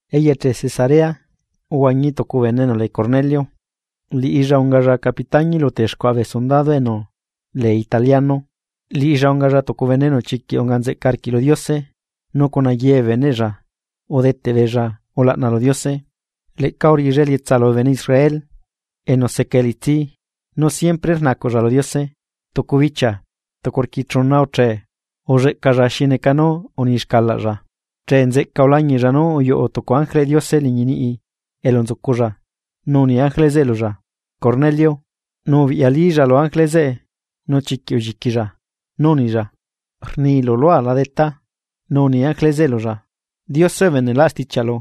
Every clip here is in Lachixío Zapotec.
Eyeche Cesarea uhuañi tucu bene enu lee Cornelio, liꞌilla ungalla capitañi lu texcuaꞌa bee sundado enu lee Italiano. Liꞌilla ungalla tucu bene enu chiquiꞌ unga nzeꞌca arquiꞌ lu Diose, nu cuna ye bee beneꞌlla udeteꞌ beella ulaꞌna lu Diose. Leꞌca uriꞌilla elietsa lubee bene Israel enu seca elitsi, nu siempre rnacuꞌlla lu Diose. Tucu bichia, tucu rquiechuna uchee, ulleꞌcalla xi neca nú uni xcalaꞌlla. Chee nzeꞌca ulañiꞌlla nú uyuꞌu tucu ángeleꞌ Diose liñi niꞌi elu nzuculla, nu uni ángele zeꞌe lulla: ―¡Cornelio! Nu ubiꞌyalilla lu ángele zeꞌe nu chiquiꞌ ulliquilla, nu unilla: ―¿Rnilu lua la Detá? Nu uni ángele zeꞌe lulla: ―Diose ubeneꞌlaꞌ stichiaꞌlu,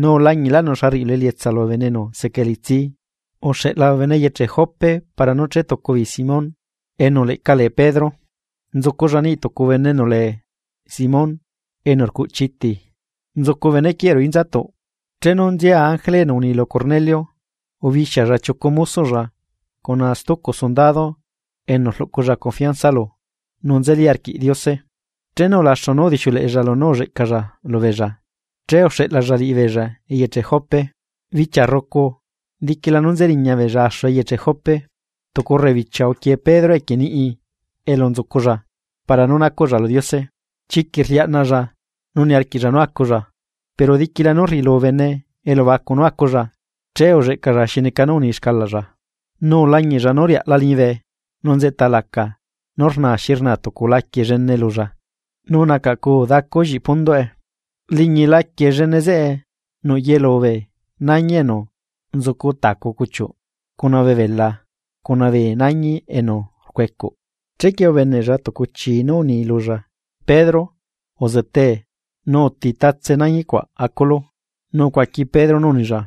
nu ulañiꞌlaꞌnu xa rriꞌilu elietsa lubee bene enu seca elitsi. Uxeꞌla bee bene eyeche Jope para nú chetucu beei Simón, enu leꞌca lee Pedro. Nzuculla niꞌ tucu bene enu leꞌca lee Simón, enu rcuꞌchi iti, nzucu bene quieꞌ ruꞌu inzatuꞌ. Chenu nzia ángele enu uni lu Cornelio, ubixialla chiucu mosoꞌlla cuna tucu sundado enu rluꞌculla confianza lu enu nzeli arquiꞌ Diose. Chenu ulaxu nú udixiuleꞌella lunú ulleꞌcalla lubeella, che uxeꞌlalla liꞌibeella eyeche Jope. Bichia rrucu, diquila nú nzeriña beella axu eyeche Jope, tucu rrebichia uquie Pedro equie niꞌi elu nzuculla para nú nacuꞌlla lu Diose. Chiquiꞌ rliaꞌnaꞌlla nu niarquiꞌlla nú aculla, pero diquila nú rriꞌilu bene elubacu nú aculla, che ulleꞌcalla xi neca nú uni xcalaꞌlla, nu ulañiꞌlla nú riaꞌla liñibe nu nzeꞌta laca nú rnaa xi rnaa tucu laquie llene lulla, nu nacaꞌcuu dacu lliꞌi. Liñi laquie llene zeꞌe nuꞌ yelu bee nañi enu tacu cuchiuꞌ, cuna bee beꞌla cuna bee nañi enu rcuecuꞌ. Chequie ubeneꞌlla tucu chii nú uni lulla: ―Pedro, uzetee, nu uti tatse nañi cuaꞌ aculu. Nu ucuaqui Pedro nú unilla: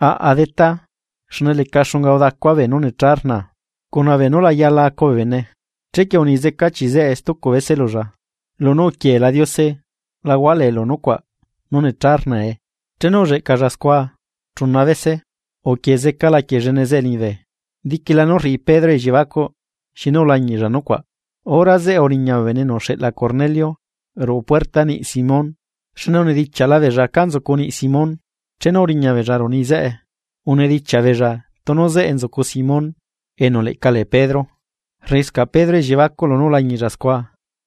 ―Aꞌa, Detá, xne leca xunga udacua beenú necha rnaa, cuna beenú la yala acu bee bene. Chequie uni zeca chii zeꞌe, stucu bese lulla: ―Lunú uquieela Diose, la hualeelu nucuaꞌ nú necha rnae. Chenu ulleꞌcalla scua chuna bese, uquie zeca laquie llene zeꞌe liñibe. Diquila nú rriꞌi Pedro elliebacuꞌ xinu ulañiꞌlla nucuaꞌ, hora zeꞌe uriña bee bene enu uxeꞌla Cornelio ruꞌu puerta niꞌi Simón, xne unidichiaꞌla beella cá nzucu niꞌ Simón. Chenu uriñabeella ruꞌu niꞌi zeꞌe, unidichiaꞌ beella tunu zeꞌe nzucu Simón, enu leꞌca lee Pedro. Rriꞌiscaꞌ Pedro elliebacuꞌ lunú ulañiꞌlla scua,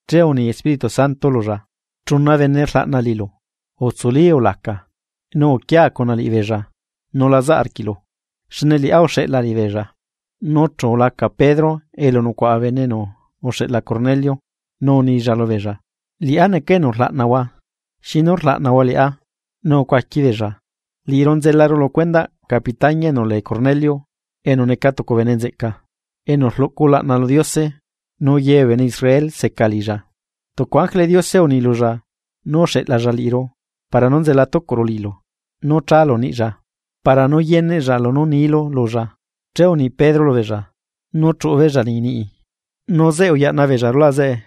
che uni Espíritu Santo lulla: ―Chuna bene rlaꞌna liꞌilu. Utsuli, ulaca, nu uquia cuna liꞌibeella nu la zaꞌ arquiꞌlu, xne liꞌá uxeꞌla liꞌibeella. Nu chu ulaca Pedro elu nucuaꞌa bee bene enu uxeꞌla Cornelio, nu unilla lubeella: ―Liꞌá neca enu rlaꞌnahua, ¿xinu rlaꞌnahua liꞌá? Nu ucuaqui beella: ―Liꞌiru nzelaru lu cuendaꞌ capitañi enu lee Cornelio, enu neca tucu bene nzeꞌca, enu rluꞌcu ulaꞌna lu Diose, nu ye bee bene Israel seca liꞌilla. Tucu ángeleꞌ Diose uni lulla nú uxeꞌlalla liꞌiru para nú nzela tucuꞌru liꞌilu nú chalu niꞌlla para nú yeneꞌlla lunú nilu lulla. Che uni Pedro lubeella nú chuꞌu beella liñi niꞌi, nu zeꞌe uyaꞌna beella rulaꞌ zeꞌe.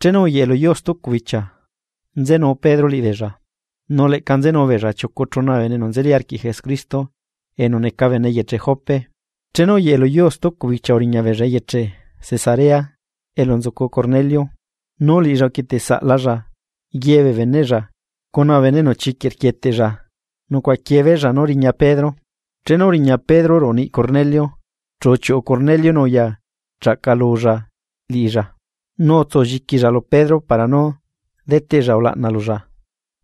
Chenu uyeꞌe luyuu stucu bichia, nzenu Pedro liꞌibeella, nu leꞌca nzenu beella chiucu chuna bee bene enu nzeli arquiꞌ Jesucristo enu neca bene eyeche Jope. Chenu uyeꞌe lu yuu stucu bichia uriña beella eyeche Cesarea, elu nzucu Cornelio nu liꞌilla uquieteꞌsaꞌlalla ye bee beneꞌlla cuna bee bene enu chiquiꞌ rquieteꞌlla nucuaꞌaquiee beella nú riña Pedro. Chenu uriña Pedro ruꞌu niꞌ Cornelio, chu uchiuꞌu Cornelio nu uya chaꞌcalulla liꞌilla, nu utsulliquilla lu Pedro para nú deteꞌlla ulaꞌna lulla.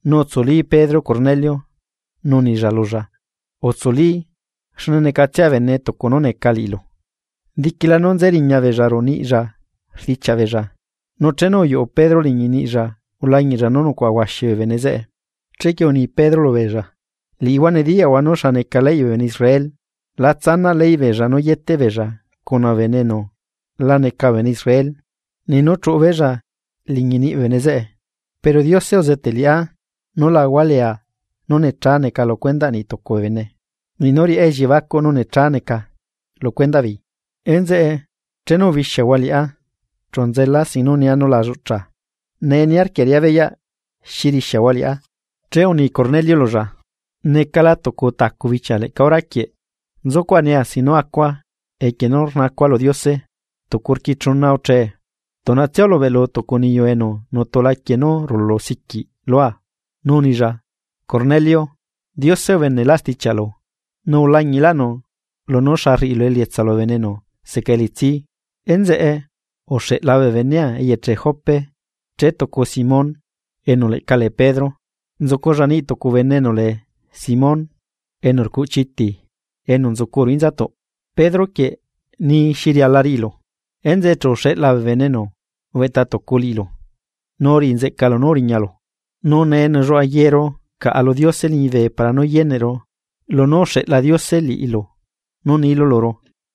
Nu utsuli Pedro Cornelio, nu unilla lulla: ―Utsuli, xne necatsia bene tucu nú necalu. Diquila nú nze riña beella ruꞌu niꞌlla rdichiaꞌ beella, nu chenu uyuꞌu Pedro liñi niꞌlla ulañiꞌlla nú nucuaꞌa huaxi bee bene zeꞌe. Chequie uni Pedro lubeella: ―Liꞌihua nediyaꞌhua nú xa neca leyꞌ bee bene Israel la tsanaꞌ leyꞌ beella nú yeteꞌ beella cuna bee bene enu la neca bee bene Israel, niꞌ nú chuꞌu beella liñi niꞌ bee bene zeꞌe. Pero Diose uzeteꞌ liꞌá nú la hualeea nú necha neca lu cuendaꞌ niꞌ tucu bee bene, niꞌ nú riꞌa elliebacuꞌ nú necha neca lu cuendaꞌ beei. Enzeꞌe, chenu ubixiahua liꞌá, chu nzela sin nú nia nú la lluꞌcha. ¿Nee, niarquia riꞌá beyaꞌ xi rixiahua liꞌá? Che uni Cornelio lulla: ―Necala tucu tacu bichia leꞌca hora quieꞌ, nzucuaꞌa nia sin nú acua equie nú rnacua lu Diose, tucu rquiechuna uche, tuꞌnatsia ulubeꞌlu tucu niyu enu nutu laquie nú rulu siquiꞌ lua. Nu unilla: “Cornelio, Diose ubeneꞌlaꞌ stichiaꞌlu, nu ulañiꞌlaꞌnu lunú xa rriꞌilu elietsa lubee bene enu seca elitsi. Enzeꞌe uxeꞌla bee benea eyeche Jope, chetucu Simón, enu leꞌca lee Pedro. Nzuculla niꞌ tucu bene enu lee Simón, enu rcuꞌchi iti enu nzucu ruꞌu inzatuꞌ. Pedro quieꞌ ni xi riala riꞌilu.” Enzeꞌe chu uxeꞌla bee bene enu ubeꞌta tucu liꞌilu, nu uriꞌinzeꞌcalu nú uriñalu. Nu nee nelluaꞌa yeru caꞌa lu Diose liñibe para nú yeneꞌru lunú uxeꞌla Diose liꞌilu nú nilu luru.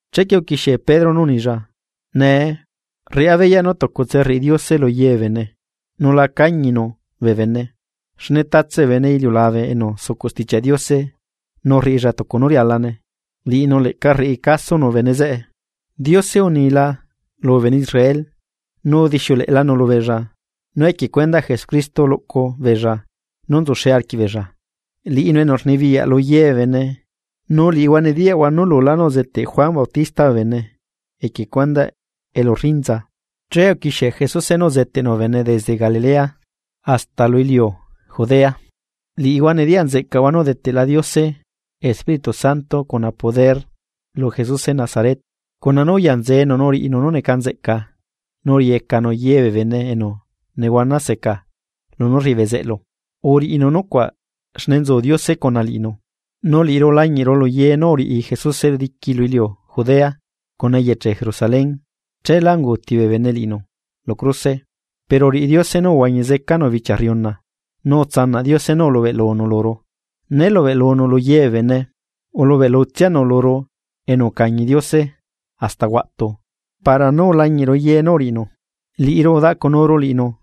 Chequie uquixie Pedro nú unilla: ―Nee, rriꞌá beyaꞌ nú tucutse rriꞌi Diose lu ye bee bene, nu la cañinu bee bene. Xne tatse bee bene iliulabe enu sucuꞌ Stichiaꞌ Diose nu rriꞌilla tucu nú rialane, liꞌinu leꞌca rriꞌi casonu bene zeꞌe. Diose unila lubee bene Israel, nu udixiuleꞌelanu lubeella nú equie cuendaꞌ Jesucristo luꞌcu beella nú nzuxe arquiꞌbeella, liꞌinu enu rnibiyaꞌ lu ye bee bene. Nu liꞌihua nediyaꞌhua nú lulá nú uzeteꞌ Juan Bautista bee bene equie cuendaꞌ elurrinza, che uquixie Jesuse nú uzeteꞌnu bee bene desde Galilea, hasta lubee iliu Judea. Liꞌihua nediyaꞌnzeꞌcahua nú udeteꞌla Diose Espíritu Santo cuna poder lu Jesuse Nazaret, cuna nú uyanzenu nu uriꞌinu nú neca nzeꞌca nu uriꞌiyecanu ye bee bene enu nehuana seca lunú rriꞌi bezeꞌlu. Uriꞌinu nucuaꞌ xne nzu Diose cuna liꞌinu. Nu liꞌiru ulañiꞌru lu ye nú uriꞌi Jesuse diqui lu iliu Judea, cuna eyeche Jerusalén. Cheela unguuti bee bene liꞌinu, lu cruse. Pero uriꞌi Diose nú uhuañi zecanu bichia rriuna, nu utsanaꞌ Diose nú ulubeꞌlunu luru. Né lubeꞌlunu lu ye bee bene, ulubeꞌlutsianu luru enu ucañila Diose hasta huaꞌtu para nú ulañiꞌru ye nú uriꞌinu. Liꞌiru udaꞌcunuru liꞌinu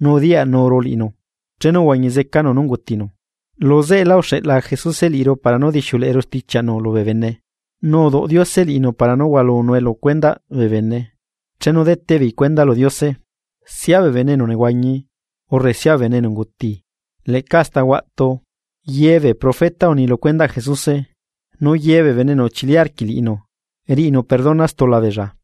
nu udiyaꞌnuru liꞌinu chenu uhuañi zecanu nú ungutinu. Lu zeꞌela uxeꞌla Jesuse liꞌiru para nú dixiuleꞌeru stichiaꞌnu lubee bene, nu uduꞌ Diose liꞌinu para nú hualunue lu cuendaꞌ bee bene chenu deteꞌ beei cuenda lu Diose, sia bee bene enu nehuañi, urre sia bee bene enu unguti. Leꞌca hasta huaꞌtu, ye bee profeta uni lu cuendaꞌ Jesuse, nu ye bee bene enu chili arquiꞌ liꞌinu riꞌinu perdona stula beella.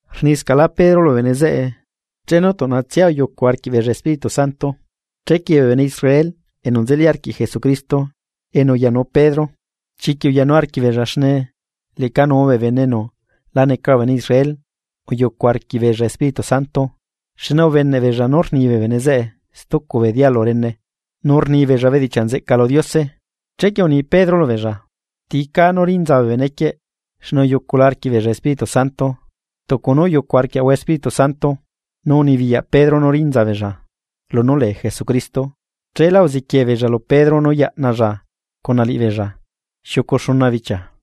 Rniscaꞌlá Pedro lubee bene zeꞌe, chenu tuꞌnatsia uyucu arquiꞌbeella Espíritu Santo. Chequie bee bene Israel enu nzeli arquiꞌ Jesucristo enu uyanu Pedro, chiquiꞌ uyanu arquiꞌbeella xne leꞌcanuu bee bene enu la neca bee bene Israel uyucu arquiꞌbeella Espíritu Santo. Xne ubeneꞌbeella nú rni bee bene zeꞌe stucu bee dialu rene, nu rnibeella bedichiaꞌ nzeꞌca lu Diose. Chequie uni Pedro lubeella: ―¿Ti cá nú rinza bee benequieꞌ xne uyucula arquiꞌbeella Espíritu Santo tucu nú uyucu arquiaꞌahua Espíritu Santo? Nu unibiyaꞌ Pedro nú rinza beella lunú lee Jesucristo. Cheelá uziquie beella lu Pedro nú yaꞌnalla cuna liꞌibeella xiucu xuna bichia.